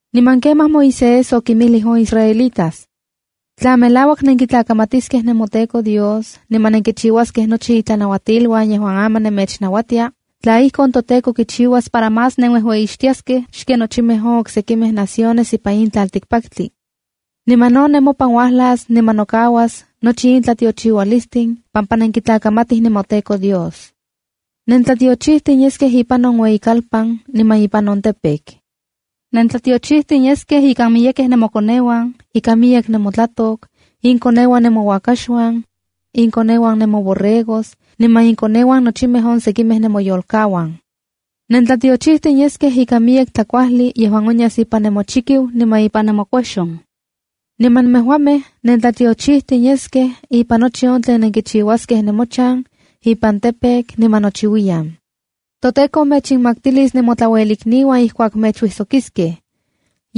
’Niman kemaj Moisés okinmijlij on israelitas: “Tla melauak nenkitlakamatiskej nemoTEKO Dios niman nenkichiuaskej nochi itlanauatiluan yejuan aman nemechnauatia, tla ijkon, toTEKO kichiuas para más nenuejueyixtiaskej xken nochimej on oksekimej naciones ipan in tlaltikpaktli. Niman no nemopan uajlas niman nokauas nochi in tlatiochiualistin, pampa nenkitlakamatij nemoTEKO Dios. ’Nentlatiochijtin yeskej ipan on ueyikalpan niman ipan on campo. ’Nentlatiochijtin yeskej ikan miyekej nemokoneuan, ikan miyek nemotlatok, inkoneuan nemouakaxuan, inkoneuan nemoborregos niman inkoneuan nochimej on sekimej nemoyolkauan. ’Nentlatiochijtin yeskej ika miyek tlakuajli yejuan onyas ipan nemochikiu niman ipan nemokuejxon. ’Niman nemejuamej nentlatiochijtin yeskej ipan nochi on tlen nenkichiuaskej nemochan, ipan campo, niman nochiuiyan. ’ToTEKO mechinmaktilis nemotlauelikniuan ijkuak mechuijsokiskej.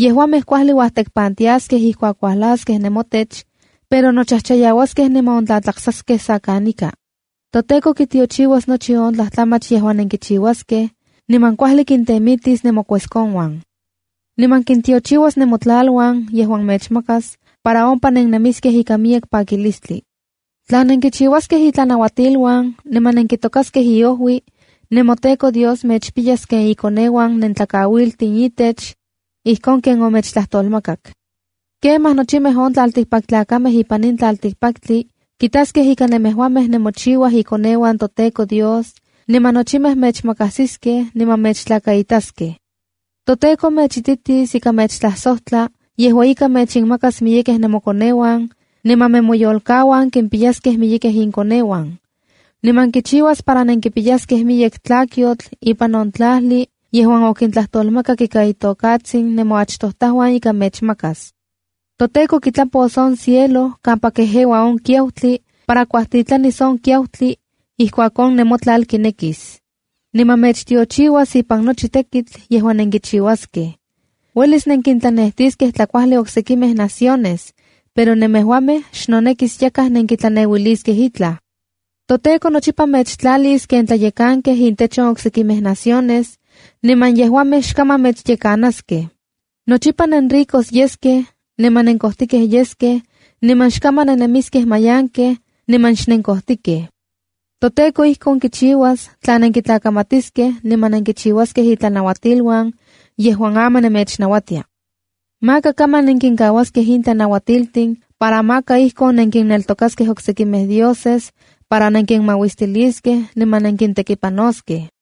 Yejuamej kuajli uajtekpantiaskej ijkuak uajlaskej nemotech, pero nochajchayauaskej niman ontlatlaksaskej sa kanika. ’ToTEKO kitiochiuas nochi on tlajtlamach yejuan nenkichiuaskej, niman kuajli kintemitis nemokueskonuan. Niman kintiochiuas nemotlaluan yejuan mechmakas para ompa nennemiskej ikan miyek pakilistli. ’Tla nenkichiuaskej itlanauatiluan niman nenkitokaskej iojui, nemoTEKO Dios mechpiyas ken ikoneuan nentlakauiltin itech, ijkon ken omechtlajtolmakak. Kemaj nochimej on tlaltikpaktlakamej ipan in tlatikpaktli kitaskej ika nemejuamej nemochiuaj ikoneuan toTEKO Dios, niman nochimej mechmakajsiskej niman mechtlakaitaskej. ToTEKO mechititis ika mechtlajsojtla yejua ika mechinmakas miyekej nemokoneuan, niman nemoyolkauan kimpiyaskej miyekej inkoneuan. Niman kichiuas para nenkipiyaskej miyek tlakyotl ipan on tlajli yejuan okintlajtolmakak ika itokatsin nemoachtojtajuan ika mechmakas. ToTEKO kitlapos on cielo kampa kejeua on kiautli para kuajtitlanis on kiautli ijkuak on nemotlal kinekis. Niman mechtiochiuas ipan nochi tekitl yejuan nenkichiuaskej. Uelis nenkintlanejtiskej tlakuajli oksekimej naciones, pero nemejuamej xnonekis yakaj nenkitlaneuiliskej itlaj. ToTEKO nochipa mechtlalis ken tlayekankej intech on oksekimej naciones, niman yejuamej xkaman mechyekanaskej. Nochipa nenricos yeskej niman nenkojtijkej yeskej, niman xkaman nennemiskej mayankej niman xnenkojtikej. ToTEKO ijkon kichiuas tla nenkitlakamatiskej niman nenkichiuaskej itlanauatiluan yejuan aman mechnauatia. Maka kaman nenkinkauaskej in tlanauatiltin para yej nenkinneltokaskej oksekimej dioses, nenkinmauistiliskej niman nenkintekipanoskej.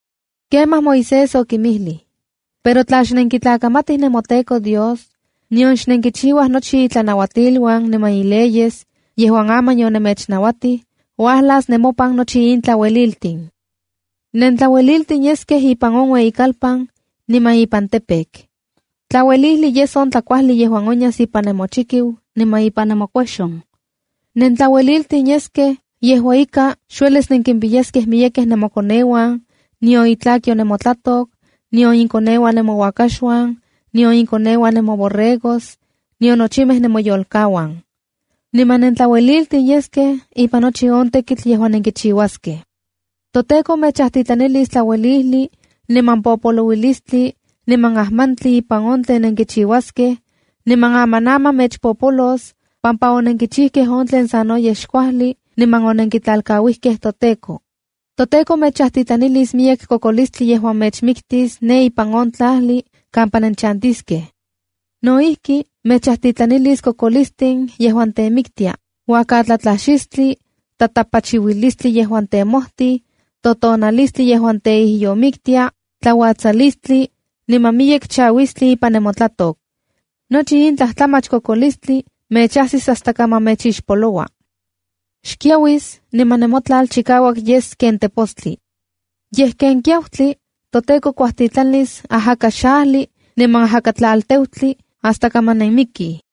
’Kemaj Moisés okinmijlij: ‘Pero tla xnenktlakamatij nemoTEKO Dios, nion xnenkichiuaj nochi itlanauatiluan niman ileyes on yejuan aman yomechnauatij, uajlas nemopan nochi in tlaueliltin: ’Nentlaueliltin yeskej ipan ueyikalpan, niman ipan campo. ’Tlauelijli yes on tlakuajli yejuan onyas ipan nemochikiu niman ipan nemokuejxon. ’Nentlaueliltin yeskej yejua ika xuelis nenkimpiyaskej miyekej nemokoneuan, nion itlakyo nemotlatok, nion inkoneuan nemouakaxuan, nion inkoneuan nemoborregos nion nochimej nemoyolkauan. ’Niman nentlaueliltin yeskej ipan nochi on tekitl yejuan nenkichiuaskej. ’ToTEKO mechajtitlanilis tlauelijli niman popolouilistli niman ajmantli ipan on tlen nenkichiuaskej, niman amanaman mechpopolos pampa onenkichijkej on tlen sanoyej xkuajli niman onenkitlalkauijkej toTEKO. ToTEKO mechajtitlanilis miyek kokolistli yejuan mechmiktis ne ipan on tlajli kampa nenchantiskej. No ijki, mechajtitlanilis kokolistin yejuan temiktia, uakatlatlajxistli, tatapachiuilistli yejuan temojtij, totonalistli yejuan teijyomiktia, tlauatsalistli, niman miyek chauistli ipan nemotlatok. Nochi in tlajtlamach kokolistli mechajsis hasta kaman mechixpoloua. Xkiauis niman nemotlal chikauak yes ken tepostli. Yej ken kiautli, toTEKO kuajtitlanis ajakaxajli niman ajakatlalteutli hasta kaman nenmijmikij.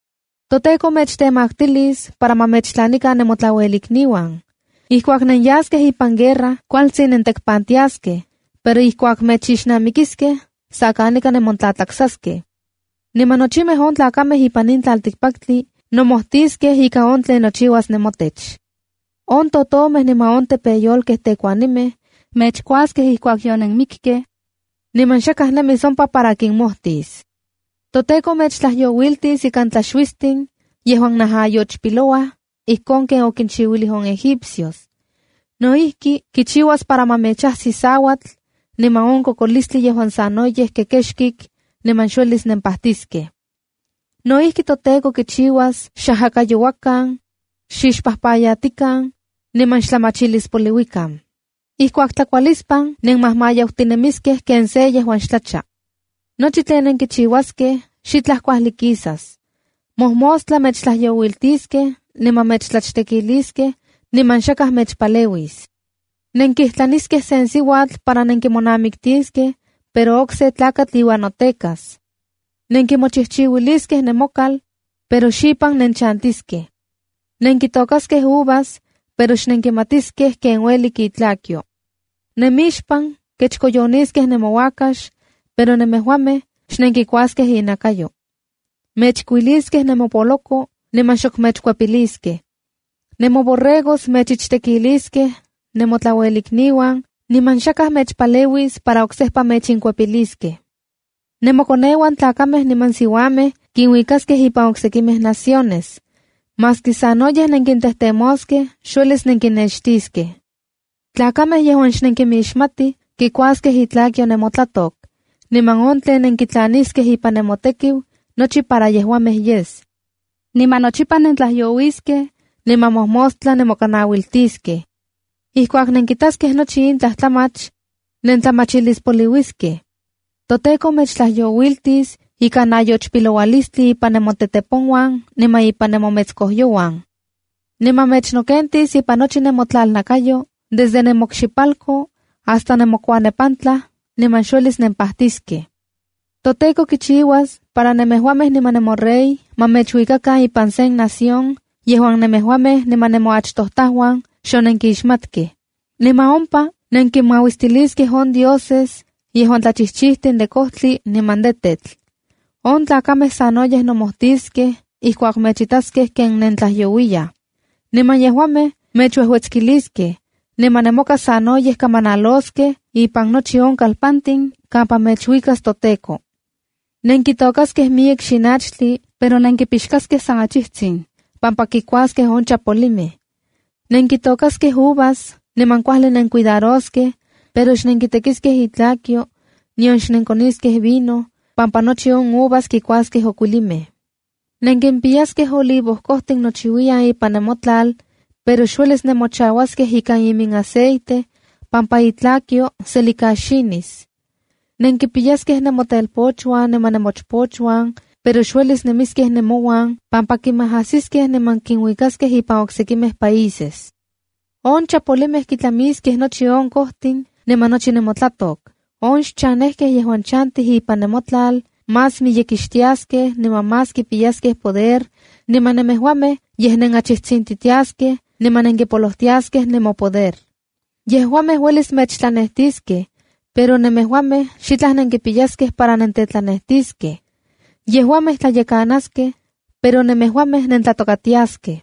’ToTEKO mechtemaktilis para ma mechtlanikan nemotlauelikniuan. Ijkuak nenyaskej ipan guerra kualtsin nentekpantiaskej, pero ijkuak mechixnamikiskej, sa kanika nemontlatlaksaskej. Niman nochimej on tlakamej ipan in tlaltikpaktli nomojtiskej ika on tlen nochiuas nemotech. On totomej niman on tepeyolkej tekuanimej mechkuaskej ijkuak yonenmikkej, niman xakaj nemis ompa para kinmomojtis. ’ToTEKO mechtlajyouiltis ikan tlaxuistin yejuan najayochpilouaj ijkon ken okinchiuilij on egipcios. No ijki, kichiuas para ma mechajsi sauatl, niman on kokolistli yejuan sanoyej kekexkik, niman xuelis nempajtiskej. No ijki, toTEKO kichiuas xajakayouakan, xixpajpayatikan, niman xtlamachilispoliuikan. Ijkuak tlakualispan nenmajmayautinemiskej ken se yejuan xtlacha. Nochi tlen nenkichiuaskej xitlaj kuajli kisas. Mojmostla mechtlajyouiltiskej niman mechtlachtekiliskej, niman xakaj mechpaleuis. Nenkijtlaniskej sen siuatl para nenkimonamiktiskej, pero okse tlakatl iuan notekas. Nenkimochijchiuiliskej nemokal, pero xipan nenchantiskej. Nenkitôkaskej uvas, pero xnenkimatiskej ken uelik itlakyo. Nemixpan kechkoyoniskej nemouakax, pero nemejuamej xnenkikuaskej inakayo. Mechkuiliskej nemopoloko niman xok mechkuepiliskej. Nemoborregos mechichtekiliskej nemotlauelikniuan, niman xakaj mechpaleuis para oksejpa mechinkuepiliskej. Nemokoneuan tlakamej niman siuamej kinuikaskej ipan oksekimej naciones. Maski sanoyej nenkintejtemoskej, xuelis nenkinnextiskej. Tlakamej yejuan xnenkinmixmatij kikuaskej itlakyo nemotlatok, niman on tlen nenkitlaniskej ipan nemotekiu nochi para yejuamej yes. Niman nochipa nentlajyouiskej, niman mojmostla nemokanauiltiskej. Ijkuak nenkitaskej nochi in tlajtlamach, nentlamachilispoliuiskej. ToTEKO mechtlajyouiltis ikan nayochpiloualistli ipan nemoteteponuan niman ipan nemometskojyouan. Niman mechnokentis ipan nochi nemotlalnakayo desde nemokxipalko hasta nemokuanepantlaj, niman xuelis nenpajtiskej. ’ToTEKO kichiuas para nemejuamej niman nemorey ma mechuikakan ipan sen nación yejuan nemejuamej niman nemoachtojtajuan xonenkixmatkej. Niman ompa nenkinmauistiliskej on dioses yejuan tlachijchijtin de kojtli niman de tetl. On tlakamej sanoyej nomojtiskej ijkuak mechitaskej ken nentlajyouiyaj. Niman yejuamej mechuejuetskiliskej, niman nemoka sanoyej kamanaloskej ipan nochi on kalpantin kampa mechuikas toTEKO. ’Nenkitôkaskej miyek xinachtli pero nenkipixkaskej san achijtsin, pampa kikuaskej on chapolimej. Nenkitôkaskej uvas niman kuajli nenkuidaroskej, pero xnenkitekiskej itlakyo, nion xnenkoniskej vino pampa nochi on uvas kikuaskej okuilimej. Nenkimpiyaskej olivo kojtin nochiuiyan ipan nemotlal, pero xuelis nemochauaskej ikan iminaceite, pampa itlakyo selikaxinis. Nenkipiyaskej nemotelpochuan niman nemochpochuan, pero xuelis nemiskej nemouan pampa kinmajajsiskej niman kinuikaskej ipan oksekimej países. On chapolimej kitlamiskej nochi on kojtin niman nochi nemotlatok. On xchanejkej yejuan chantij ipan nemotlal más miyekixtiaskej niman más kipiyaskej poder, niman nemejuamej yej nenachijtsintitiaskej niman nenkipolojtiaskej nemopoder. Yejuamej uelis mechtlanejtiskej, pero nemejuamej xitlaj nenkipiyaskej para nentetlanejtiskej. Yejuamej tlayekanaskej, pero nemejuamej nentlatokatiaskej.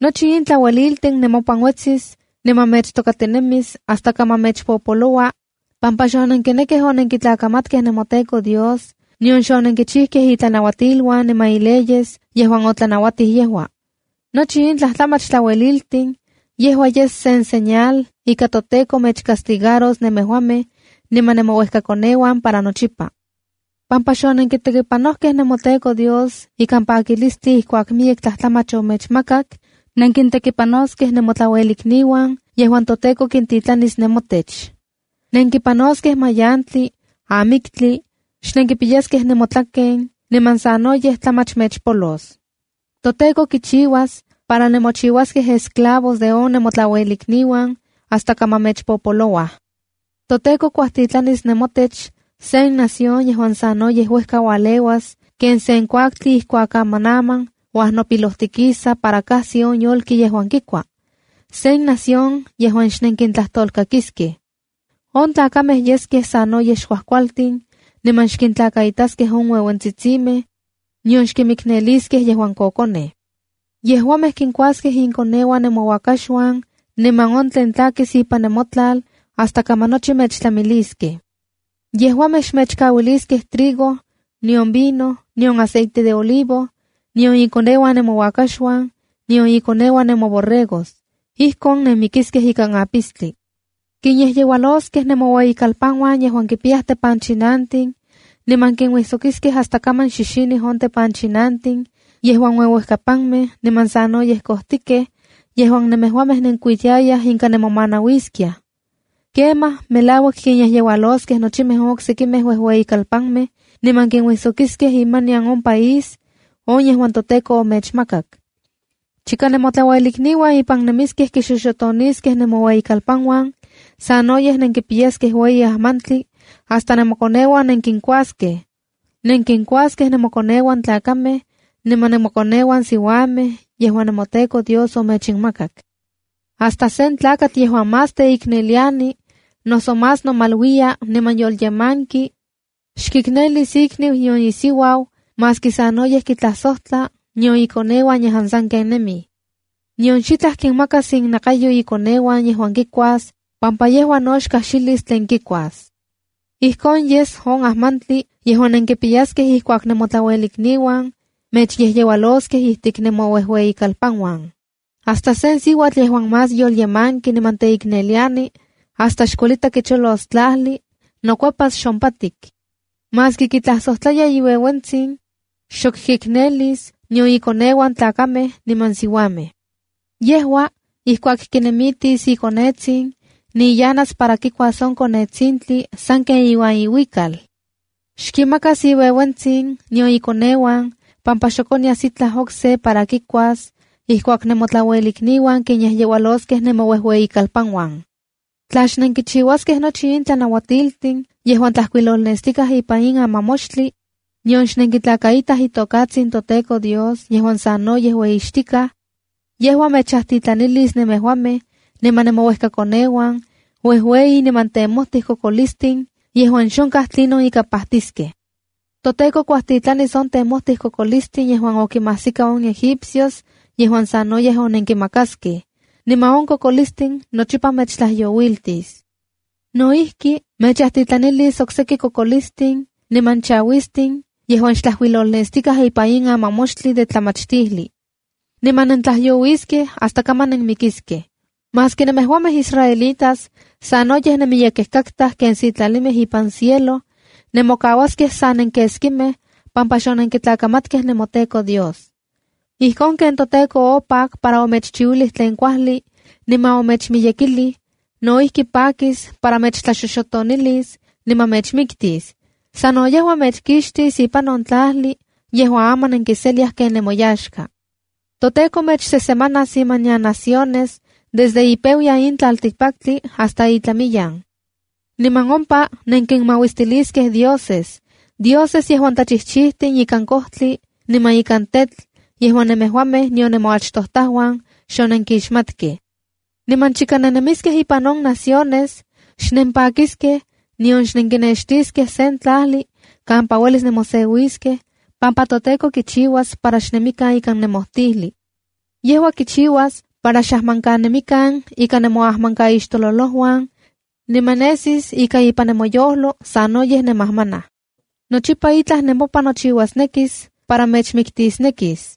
’Nochi in tlauelililtin nemopan uetsis niman mechtokatinemis hasta kaman mechpopoloua, pampa xonenkinekkej onenkitlakamatkej nemoTEKO Dios nion xonenkichijkej itlanauatiluan niman ileyes yejuan otlanauatij yejua. Nochi in tlajtlamach tlaueliltin, yejua yes sen señal ika toTEKO mechcastigaros nemejuamej niman nemouejkakoneuan para nochipa. Pampa xonenkitekipanoj nemoTEKO Dios ikan pakilistli ijkuak miyek tlajtlamach omechmakak, nenkintekipanoskej nemotlauelikniuan yejuan toTEKO kintitlanis nemotech. Nenkipanoskej mayantli, amiktli, xnenkipiyaskej nemotlaken niman sanoyej tlamach mechpolos. ToTEKO kichiuas para nemochiuaskej esclavos de on nemotlauelikniuan hasta kaman mechpopolouaj. ToTEKO kuajtitlanis nemotech sen nación yejuan sanoyej uejka ualeuas ken sen kuaktli ijkuak amanaman uajnopilojtikisa para kajsi on yolki yejuan kikua. Sen nación yejuan xnenkintlajtolkakiskej. On tlakamej yeskej sanoyej xkuajkualtin, niman xkintlakaitaskej on ueuentsitsimej, nion xkinmikneliskej yejuan kokonej. Yejuamej kinkuaskej inkoneuan nemouakaxuan niman on tlen tlakis ipan nemotlal, hasta kaman nochi mechtlamiliskej. Yejuamej xmechkauiliskej trigo, nion vino, nion aceite de olivo, nion ikoneuan nemouakaxuan, nion ikoneuan nemoborregos. Ijkon nenmikiskej ikan apistli. Kinyejyeualoskej nemoueyikalpanuan yejuan kipiyaj tepanchinantin, niman kinuijsokiskej hasta kaman xixinij on tepanchinantin yejuan ueuejkapanmej niman sanoyej kojtikej yejuan nemejuamej nenkuitiayaj inka nemomanauiskiaj. Kemaj, melauak kinyejyeualoskej nochimej on oksekimej uejueyikalpanmej niman kinuijsokiskej imanian on nemopaís on yejuan toTEKO omechmakak. Chika nemotlauelikniuan ipan nemiskej kixoxotoniskej nemoueyikalpanuan, sanoyej nenkipiyaskej ueyi mayantli hasta nemokoneuan nenkinkuaskej. Nenkinkuaskej nemokoneuan tlakamej, niman nemokoneuan siuamej yejuan nemoTEKO Dios omechinmakak. Hasta sen tlakatl yejuan más teikneliani, noso más nomaluiya niman yolyemanki, xkiknelis ikniu nion isiuau maski sanoyej kitlajsojtla, nion ikoneuan yejuan sanken nemij. Nion xitlaj kinmakas innakayo ikoneuan yejuan kikuas pampa yejua no xkajxilis tlen kikuas. Ijkon yes on ajmantli yejuan nenkipiyaskej ijkuak nemotlauelikniuan mechyejyeualoskej ijtik nemouejueyikalpanuan. Hasta sen siuatl yejuan más yolyemanki niman teikneliani, hasta xkuelita kicholos tlajli, nokuepas xompatik. Maski kitlajsojtlaya iueuentsin, xok kiknelis, nion ikoneuan tlakamej niman siuamej. Yejua, ijkuak kinemitis ikonetsin, niyanas para kikuas on konetsintli, sanken iuan iuikal. Xkimakas iueuentsin nion ikoneuan pampa xok onyas itlaj okse para kikuas ijkuak nemotlauelikniuan kinyejyeualoskej nemouejueyikalpanuan. ’Tla xnenkichiuaskej nochi in tlanauatiltin yejuan tlajkuilolnestikaj ipan in amamoxtli, nion xnenkitlakaitaj itokatsin toTEKO Dios yejuan sanoyej ueyixtikaj, yejua mechajtitlanilis nemejuamej niman nemouejkakoneuan uejueyi niman temojti kokolistin yejuan xonkaj tlinon ika pajtiskej. ToTEKO kuajtitlanis on temojtij kokolistin yejuan okinmajsika on Egipcios, yejuan sanoyej onenkimakaskej. Niman on kokolistin nochipa mechtlajyouiltis. No ijki, mechajtitlanilis ok seki kokolistin niman chauistin yejuan xtlajkuilolnestikaj ipan in amamoxtli de tlamachtijli. Niman nentlajyouiskej hasta kaman nenmikiskej. Maski nemejuamej israelitas sanoyej nenmiyekej katkaj ken sitlalimej ipan cielo, nemokauaskej sa nenkeskimej pampa xonenkitlakamatkej nemoTEKO Dios. ’Ijkon ken toTEKO opak para omechchiuilij tlen kuajli niman omechmiyekilij, no ijki pakis para mechtlaxoxotonilis, niman mechmiktis. Sano yejua mechkixtis ipan on tlajli yejuan aman nenkiseliaj ken nemoyaxka. ToTEKO mechsesemanas imanian naciones desde ipeuyan in tlaltikpaktli hasta itlamiyan. Niman ompa nenkinmauistiliskej dioses, dioses yejuan tlachijchijtin ikan kojtli niman ikan tetl yejuan nemejuamej nion nemoachtojtajuan xonenkimixmatkej. Niman chika nennemiskej ipan on naciones, xnempakiskej, nion xnenkinextiskej sen tlajli kampa uelis nemoseuiskej, pampa toTEKO kichiuas para xnemikan ikan nemojtijli. Yejua kichiuas para xajmankanemikan ika on nemoajmankaixtololojuan, niman nesis ika ipan nemoyojlo sanoyej nenmajmanaj. Nochipa itlaj nemopan nochiuasnekis para mechmiktisnekis.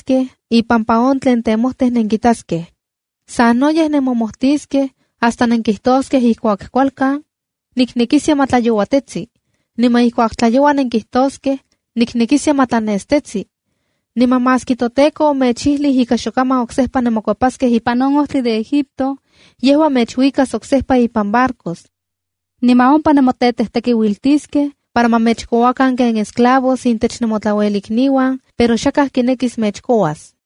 ipampa on tlen temojtij nenkitaskej. Sanoyej nemomojtiskej hasta nenkijtoskej ijkuak kualkan ‘¡Niknekiskia ma tlayouatitetsi!’ Niman ijkuak tlayoua nenkijtoskej: ‘¡Niknekiskia ma tlanestetsi!’ Niman maski toTEKO omechijlij ika xokaman oksejpa nenmokuepaskej ipan on ojtli de Egipto, yejua mechuikas oksejpa ipan barcos. Niman ompa nemotetejtekiuiltiskej para ma mechkouakan ken esclavos intech nemotlauelikniuan, pero xakaj kinekis mechkouas.”